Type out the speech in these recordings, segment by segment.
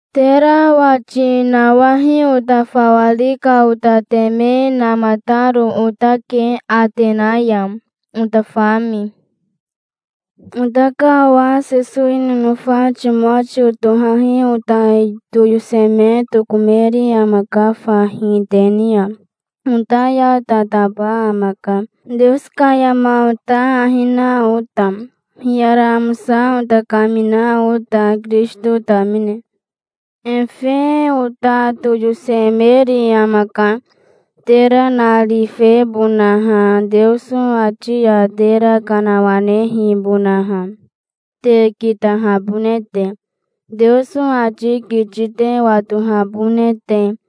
Tera wati nawahi ota fawa ri ka ota teme namataro otake Atena ya, ota fami. Ota ka owa Sesowi nonofa Timotio tohahi ota toyoseme tokomeri amaka fahi te ni ya. Ota ya tataba amaka, Teoso ka yama ota ahi na ota, hiyara amosa ota kamina ota, Kirisito tamine. Efe ota toyosemeri amaka, tera narifebonaha, Teoso ati ya tera kanawanehibonaha, te kitahabone te, Teoso ati kiti te watohabone te,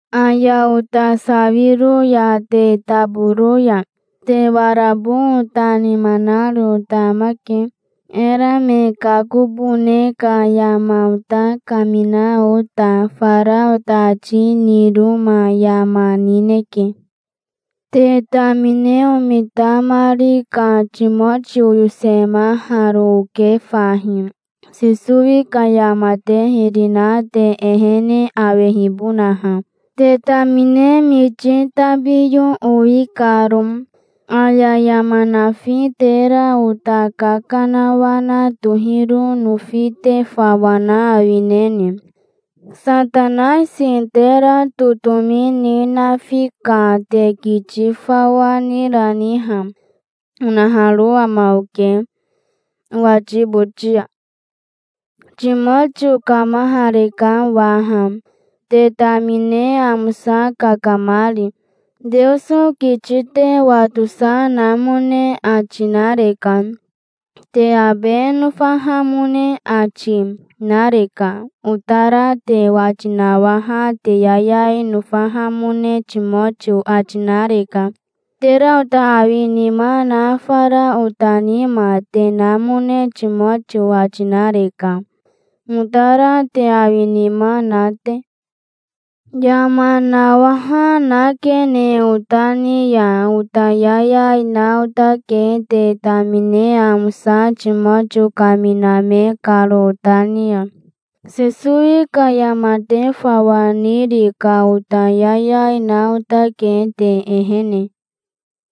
Aya ota sawiro ya te taboro ya, te warabo ota nima naro ota amake, era me kakobone ka yama ota kamina ota. Fara ota ati niroma yama nineke. Te tamine omitamari ka Timotio oyosemaharo oke fahi, Sesowi ka yama te hiri na te ehene awehibonaha, te tamine miti tabiyo owi karo. "Aya yama nafi tera ota kakanawana tohiro nofi te fawa na awineni? Satanaisi tera totomi ni nafi ka te kiti fawa nirani ha?" onaharo ama oke, owati boti ya. Timotio kamahareka waha, te tamine amosa kakamari. Teoso kiti te watosa namone ati nareka. Te abe nofahamone ati, nareka. Otara te wati nawaha te yayai nofahamone Timotio ati nareka. Tera ota awi nima na fara ota nima te namone Timotio ati nareka, otara te awi nima na te. Yama nawaha nakene ota ni ya. Ota yayai na otake te tamine amosa Timotio kaminame karo ota ni ya. Sesowi ka yama te fawa niri ka ota yayai na otake te ehene.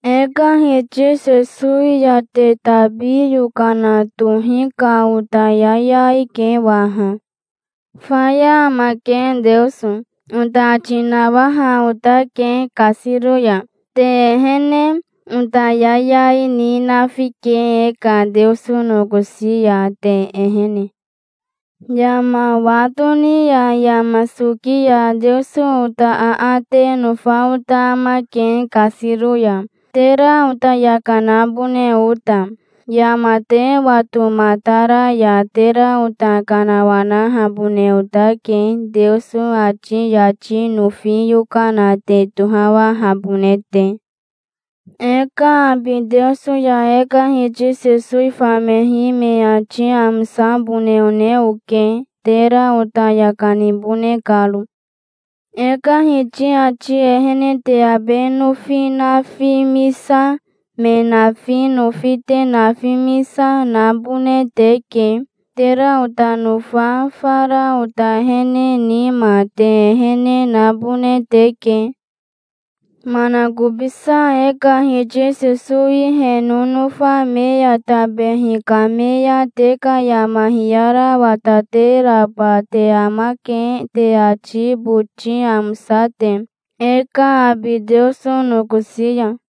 E ka Hiti Sesowi ya te tabi yokana tohi ka ota yayai ke waha. "Faya amake Teoso", ota ati nawaha otake kasiro ya, te ehene. Ota yayai ni nafike e ka Teoso nokosi ya, te ehene. Yama wa toni ya yama soki ya Teoso ota aate nofa ota amake kasiro ya, tera ota yaka nabone ota. Yama te watomatara ya tera ota kanawanahabone otake, Teoso ati yati nofi yokana te tohawahabone te. E ka abi Teoso ya e ka Hiti Sesowi famehi me ati amosabone one oke, tera ota yaka nibone karo. E ka Hiti ati ehene te abe nofi nafimisa, me nafi nofi te nafimisa, nabone teke. Tera ota nofa fara ota ehene nima te ehene nabone teke. Manakobisa e ka Hiti Sesowi he nonofa me ya tabehi kame ya te ka yama hiyara watateraba te amake te ati boti amosa te, e ka abi Teoso nokosi ya.